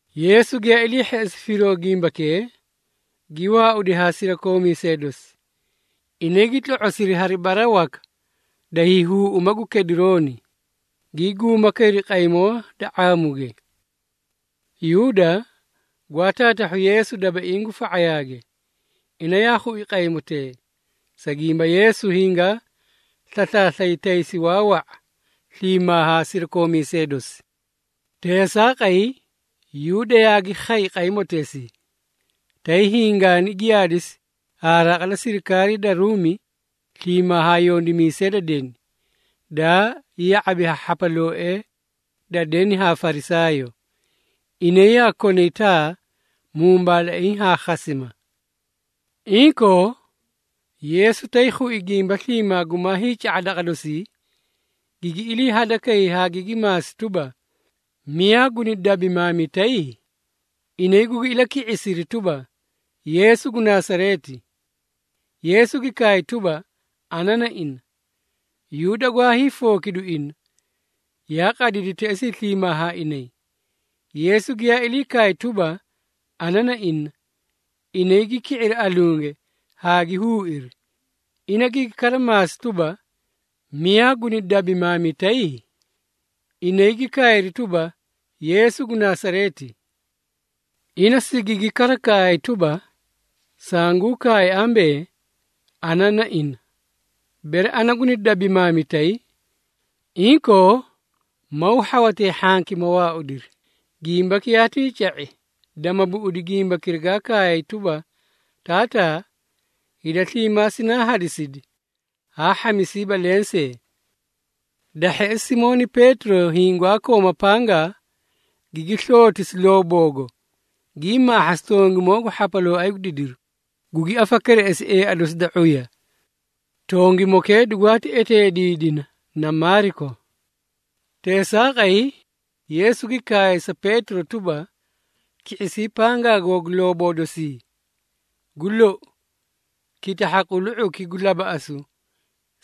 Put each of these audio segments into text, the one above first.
Yeesu giyaa ilii hheꞌesi firoo gimbakee, gi waaudi haa sirakoomiisee dosi. Inay gi tlo⁄osiri hari bara waka da hiihuuꞌuma gu Kedirooni, gii guuma kayri qaymoo da ⁄aamuge. Yuuda, gwaa taatahhu Yeesu dabaiĩ gu fa⁄ayaage, ina yaa khui qaymotee, sa gimba Yeesu hingaa slaslaaslay taysi waa wa⁄a sliimaa haa sirakoomiisee dosi. Teesaaqay, Yuuda yaagi khay qaymoteesii, tay hingaani giyaadisi ha raqa da sirikaarii da Ruumi sliimaa haa yondimiisee da deni, daa ya⁄abi haa hhapalooee da deni haa Farisaayoo. Inay yaa konay taa, mumbaalaiĩ haa khasima. Inkoo, Yeesu tay khui gimba sliimaa gumaa hiica⁄a daqa dosii, gigi ilii hadakay haa gigi maasi tuba, “Miyaa guni dabimaamitay?” Inay gugi ilaki⁄isiri tuba, “Yeesu gu Nasareeti!” Yeesu gi kaay tuba, “Ana na ina.” Yuuda gwaa hiifookidu ina, yaa qadidi teꞌesii sliimaa haa inay. Yeesu giyaa ilii kaay tuba, “Ana na ina,” inay gi ki⁄iri alunge haa gi huuiri. Ina gigi kara maasi tuba, “Miyaa guni dabimaamitay?” Inay gi kaayri tuba, “Yeesu gu Nasareeti!” Ina sigigi kara kaay tuba, “Sanguu kaay ambee, ana na ina. Bere ana guni dabimaamitay, inkoo maw hhawatee hhanki, ma waaudiri.” Gimbaki yaatii ca⁄i, dama buꞌudi gimbakira gaa kaay tuba, “Taataa, hida sliimaa sinaa hadisidi, haa hhamisiiba lensee.” Da hheꞌesi, Simooni Peetiro hiĩ gwaa kooma pangaa, gigi slootisi looboogo, gii maahhasi tongimoo gu hhapalooay gu didiru, gugi afakereꞌesi eea dosi da ⁄uya. Tongimokee dugwaati eteediidina na Maaliko. Teesaaqay, Yeesu gi kaay sa Peetiro tuba, “Ki⁄isii pangaa googu looboo dosii! Gu lou, kitahha qulu⁄uki gu labaꞌasu,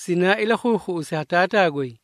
sinaa ilakhuukhuꞌusi ha Taataa goy.”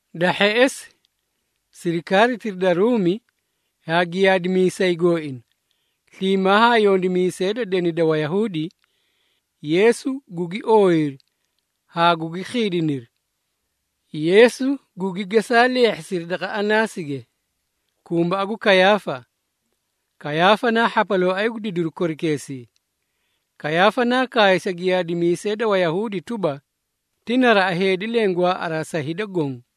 Da hheꞌesi, sirikaaritira da Ruumi haa giyaadimiisay gooina, sliimaa haa yondimiisee da deni da Wayahuudi, Yeesu gugi ooyiri haa gugi khiidiniri. Yeesu gugi gesaa leehhisiri daqa Anaasige, kumbaꞌa gu Kayaafa. Kayaafa naa hhapalooay gu didiru korikeesii. Kayaafa naa kaay sa giyaadimiisee da Wayahuudi tuba, ti naraꞌa heedi leẽ gwaaꞌaraa sa hida goõ.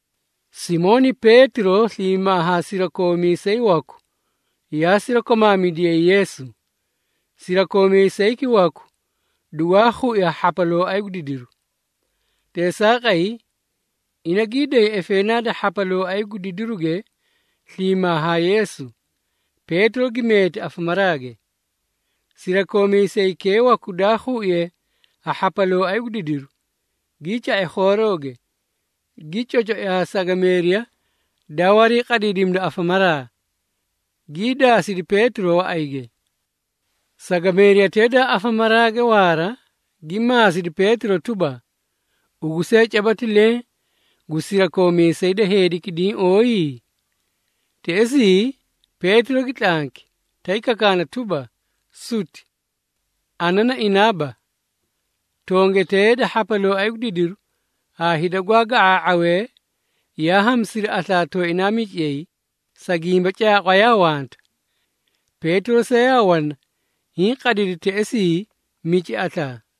Simooni Peetiro sliimaa haa sirakoomiisay waku yaa sirakomaamidiyay Yeesu. Sirakoomiisayki waku dugwaa khui ha hhapalooay gu didiruge. Teesaaqay, ina gii day efeenaa da hhapalooay gu didiru sliimaa haa Yeesu. Peetiro gi meeti afamaraage. Sirakoomiisaykee waku daa khuiye ha hhapalooay gu didiru, gii ca⁄i khoorooge, gi cocoi haa sagameeriya daa wariiqadiidimida afamaraa, gii daasidi Peetiro waꞌayge. Sagameeriyatee daa afamaraage waara gi maasidi Peetiro tuba, “Ugu see caba ti leẽ gu sirakoomiisee da heediki, diĩ ooyi?” Teꞌesii, Peetiro gi tlanki, tay kakaana tuba, “Suti! Ana na inaaba!” Tongetee da hhapalooay gu didiru haa hida gwaa ga⁄aa⁄awee yaa hamisiri aslaa tooinaa miciyay, sa gimba caaqwa yaa wanta. Peetiro see yaa wana hiĩ qadidi teꞌesii mici aslaa.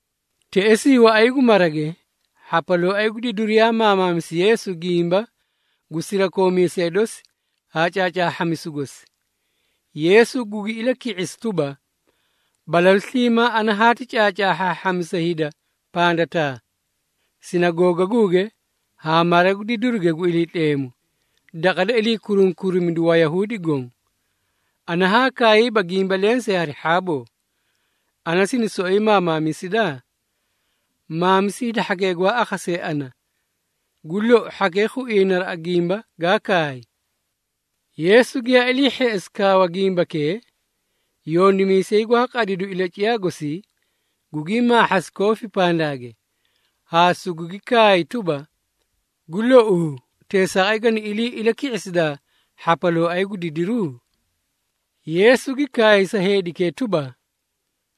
Teꞌesii, waꞌay gu marage, hhapalooay gu didiru yaa maamaamisi Yeesu gimba gu sirakoomiisee dosi haa caacaahhamisu gosi. Yeesu gugi ilaki⁄isi tuba, “Balalu sliimaa ana haati caacaahhaahhamisa hida pandataa, sinagoogaguuge haa mara gu didiruge gu Iliitleemu, daqa da ilii kurunkurimidu Wayahuudi goõ. Ana haa kaayiiba gimba lensee hari hhaaboo. Ana sini soꞌoyi maamaamisida? Maamisi hida hhakee gwaa akhasee ana, gu lou hhakee khuiyay naraꞌa gimba gaa kaay.” Yeesu giyaa ilii hheꞌesi kaawa gimbakee, yondimiisay gwaa qadidu ilaciyaa gosii, gugii maahhasi koofii pandaage, haa sugugi kaay tuba, “Gu louu, teesaaqay gani ilii ilaki⁄isidaa hhapalooay gu didiru?” Yeesu gi kaay sa heedikee tuba,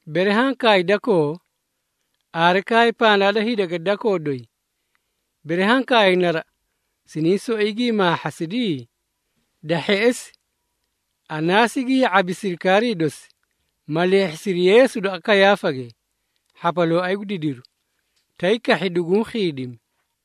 “Bere haã kaay dakoo, aare kaay pandaa da hidage dakoo doyi. Bere haã kaay naraꞌa, siniĩ soꞌoyi gii maahhasidi?” Da hheꞌesi, Anaasi gi ya⁄abi sirikaarii dosi, ma leehhisidi Yeesu daqa Kayaafage, hhapalooay gu didiru, tay kahhi duguũ khiidimi.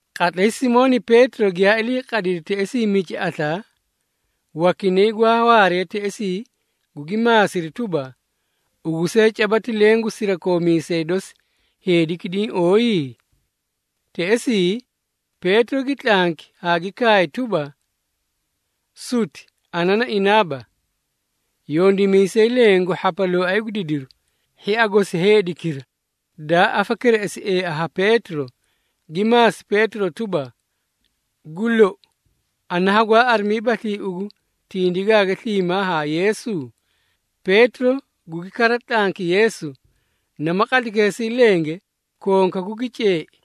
Qatlay Simooni Peetiro giyaa ilii qadidi teꞌesii mici aslaa, wakinay gwaa waaree teꞌesii gugi maasiri tuba, “Ugu see caba ti leẽ gu sirakoomiisee dosi heedikee diĩ ooyi?” Teꞌesii, Peetiro gi tlanki haa gi kaay tuba, “Suti! Ana na inaaba!” Yondimiisay leẽ gu hhapalooay gu didiru, hhia gosi heedikira, daa afakereꞌesi eea ha Peetiro, gi maasi Peetiro tuba, “Gu lou, ana hagwaa arimiibaslii ugu tindigaage sliimaa haa Yeesu?” Peetiro gugi kara tlanki Yeesu, nama qatlaykeesii lenge, konkaku gi ceei.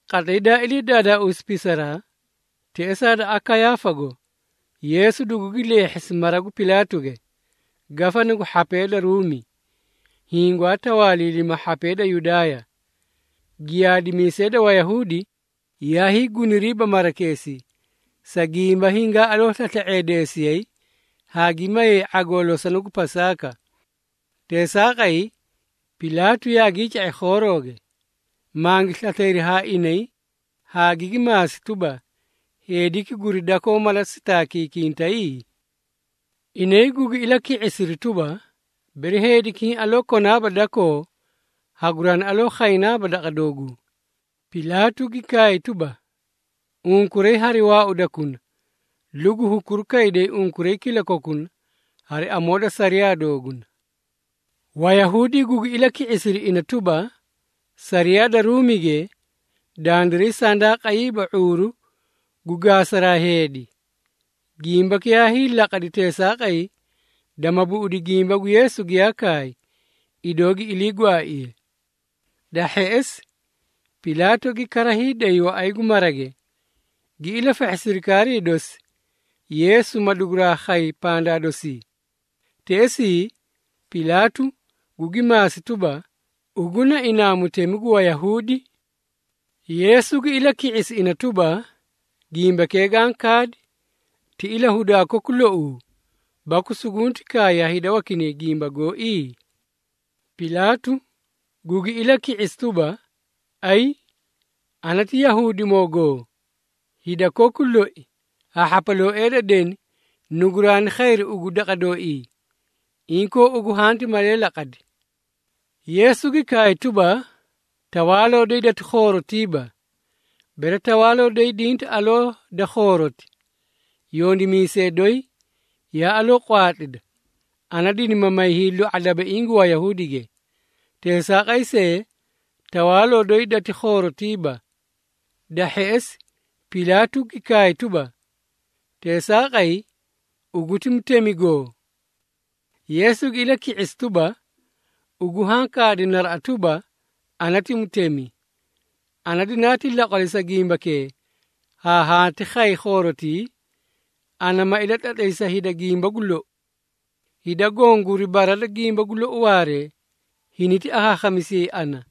Qatlay daa ilii daadaausi pisaraa, teꞌesaa daqa Kayaafago Yeesu dugugi leehhisi mara gu Pilaatuge, Gafana gu hhapee da Ruumi, hiĩ gwaa tawaaliilima hhapee da Yudaaya. Giyaadimiisee da Wayahuudi, yaa hiiguniriiba marakeesii, sa gimba hingaa aloo slasla⁄eediisiyay haa gi mayay ⁄agoo losona gu Pasaaka. Teesaaqay, Pilaatu yaagii ca⁄i khoorooge, mangi slaslayri haa inay haa gigi maasi tuba, “Heediki guri dakoo mala sitaakikintay?” Inay gugi ilaki⁄isiri tuba, “Bere heediki hiĩ aloo konaaba dakoo, haguraani aloo khaynaaba daqa dooguu.” Pilaatu gi kaay tuba, “Unkuray hari waaudakuna, lugu hukuruu kayda unkuray kilakokuna hari amoo da sariyaa dooguna.” Wayahuudi gugi ilaki⁄isiri ina tuba, “Sariyaa da Ruumige, dandiray sandaa qayiiba ⁄uuru gu gaasaraa heedi.” Gimbaki yaa hiilaqadi teesaaqay, dama buꞌudi gimba gu Yeesu giyaa kaay, idoo gi ilii gwaaiye. Da hheꞌesi, Pilaatu gi kara hiiday waꞌay gu marage, gi ilafahhi sirikaarii dosi, Yeesu maduguraa khay pandaa dosii. Teꞌesii, Pilaatu gugi maasi tuba, “Ugu na inaa Mutemi gu Wayahuudi?” Yeesu gi ilaki⁄isi ina tuba, “Gimbakee gaã kaadi ti ilahudaa koku louu baku sugunti kaay ha hida wakinay gimba gooi?” Pilaatu gugi ilaki⁄isi tuba, “Ayi! Ana ti Yahuudimoogoo? Hida koku loi haa hhapalooee da deni nuguraani khayri ugu daqa dooii. Inkoo, ugu hanti malee laqadi?” Yeesu gi kaay tuba, “Tawaaloo doyi dati khoorotiiba. Bere tawaaloo doyi dinti aloo da khooroti, yondimiisee doyi yaa aloo qwaatlida, ana dinima may hiilu⁄a dabaiĩ gu Wayahuudige. Teesaaqay see, tawaaloo doyi dati khoorotiiba.” Da hheꞌesi, Pilaatu gi kaay tuba, “Teesaaqay, ugu ti mutemigo?” Yeesu gi ilaki⁄isi tuba, “Ugu haã kaadi naraꞌa tuba, ana ti mutemi. Ana dinaati laqwali, sa gimbakee haati khay khoorotii, ana ma ilatlatlay sa hida gimba gu lou. Hida goõ guri bara da gimba gu lou waaree, hiniti akhaakhamisiyayi ana.”